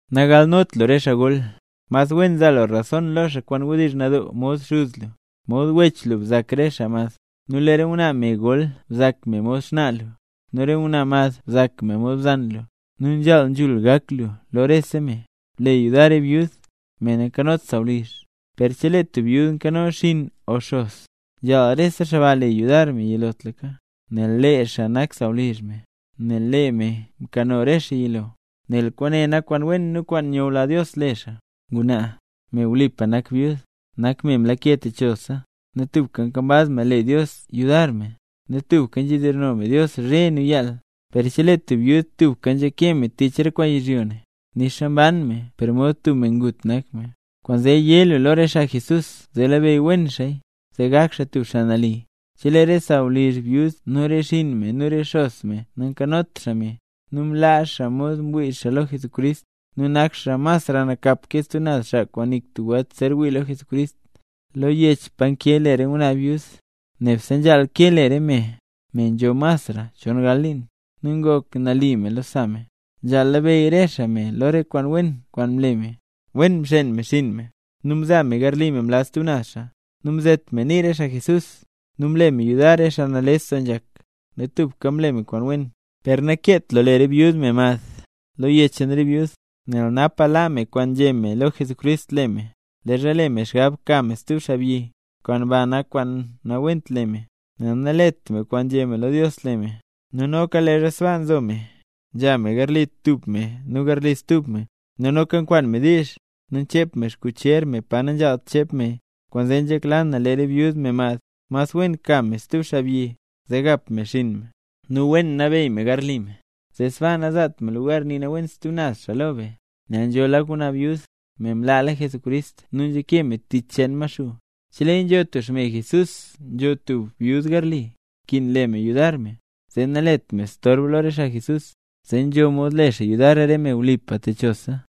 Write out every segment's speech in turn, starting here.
Nagalnot lu re xaa gol, mas wen zaa lu rason lo xaa kwaan wdizh nadoo mod xuz lu, mod wech lu bzak re xaa mad, nu lee re ngwnaa me gol bzak me mod xnaa lu, nu re ngwnaa mad bzak me mod bzan lu, nu nzhaal nzhul gak lu lo rese me. Ble yudar re byud, me nakanot sawlizh. Per chelee tub byud nkano xinn o xos, nzhaal rese xaa ba le yudar me yilotlaka, nel lee xaa nak sawlizh me, nel lee me mkano re xaa yilo. Nel kwaane nak kwaan wen nu kwaan nyula Dios le xaa. Ngwnaa, me wlipa nak byud, nak me mlake techolalsa, nu tubka nkambaz me le Dios yudar me, nu tubka nzhedizhno me Dios zhe nu yaal. Per chelee tub byud tubka nzhake me tich re kwaan yizhyo ne, nixa mban me per mod tub me ngut nak me. Kwaanzee yé lu lo re xaa Jesús zee labeyy wen xaaya, zee gak xaa tub xaa nali. Chelee re sawlizh byud nu re xinn me nu re xos me nankanot xaa me, nu mlaa xaa mod mwii xaa lo Jesucrist, nu nak xaa masra nakap ke stub naz xaa, kwaan nik tub welt zer wii lo Jesucrist. Lo yech pa nkee le re ngwnaa byud, nebse nzhaal kee le re me: me nzho masra chon gal liin, nu ngok me nali lo sa me, nzhaal labeyy re xaa me lo re kwaan wen kwaan mle me, wen mxeen me xinn me, nu mzaa me garli me mlaz stub naz xaa, nu mzet me nii re xaa mle nambey Jesús, nu mle me yudar re xaa nales doo nzhak, nu tubka mle me kwaan wen. Per nakeet lu le byud, me mad, lo yech cheen re byud. Nel napaka laa me kwaan nzhé me lo Jesucrist le me, leezha le me xgab ka me stub xaabyi. Kwaan ba nak kwaan nawent le me, nel nalet me kwaan nzhé me lo Dios le me. Nu noka leezha sbaasa nzo me, nzha me garli tub me nu garli stub me, nu noka nkwaan me diizh, nu nchep me xkucher me pa nanzhaalt chep meya. Kwaanzee nzhekla na lee re byud, me mad, mas wen ka me stub xaabyi, nu gap me xinn me, nu wen nabeyy me garli me, zee sbaa nazaat me lugar nii nawent stub naz xaa lo be. Nel nzho lak ngwnaa byud, me mlaala Jesucrist nu nzhake me tich cheen Maxuu. Cheleeya nzho tub xme Jesús nzho tub byud garli, nkin le me yudar me, zee nalet me storb lo re xaa Jesús, zee nzho mod le xaa yudar re me wlipa techolalsa.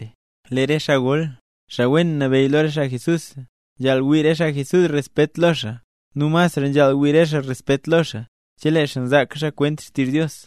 Lee re xaa gol, xaa wen nabeyy lo re xaa Jesús, nzhaal wii re xaa Jesús respet lo xaa, nu masra nzhaal wii re xaa respet lo xaa, chelee xaa nzaaka xaa kwent xtizh Dios.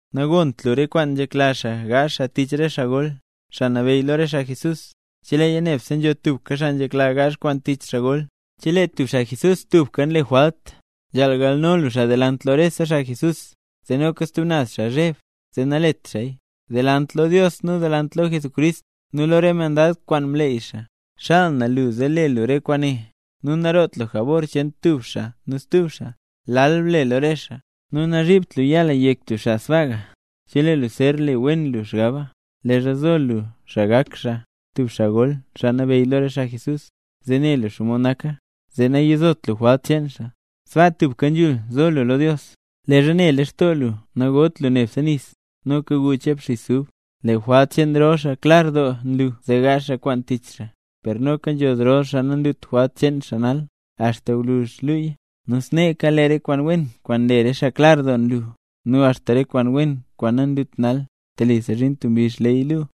Nagont lu re kwaan nzhekla xaa gaazh xaa tich re xaa gol, xaa nabeyy lo re xaa Jesús, cheleeya nebse nzho tubka xaa nzhekla gaazh kwaan tich xaa gol. Chelee tub xaa Jesús tubka nle jwalt, nzhaal galno lu xaa delant lo rese xaa Jesús, zee noka stub naz xaa zheb, zee nalet xaaya. Delant lo Dios, nu delant lo Jesucrist, nu lo re mandad kwaan mleey xaa, xaal na lu zee le lu re kwaane; nu naroot lu jabor cheen tub xaa nu stub xaa, lal ble lo re xaa. Nu nazhibt lu yaa lu yek tub xaa sbaaya, chelee lu zer le wen lu xgab, leezha zo lu xaa gak xaa tub xaa gol, xaa nabeyy lo re xaa Jesús. Yilotlaka wen wen nzhaal labeyy lu xaa, zee ne lu xomod nak xaa, zee nayizot lu jwalt cheen xaa. Sbaa tubka nzhul zo lu lo Dios. Leezha ne lextoo lu nagot lu neb nis, noka gu chep xis ub. Lee jwalt cheen rol xaa klar doo nlu zee gaazh xaa kwaan tich xaa, per noka nzho zrol xaa nanlut jwalt cheen xaa nal, axta gwluzh luuya. Nu sneeka, lee re kwaan wen kwaan nle xaa klar doo nlu, nu axta re kwaan wen kwaan nanlut nal, telisa zhin tub mbizh leeya yun.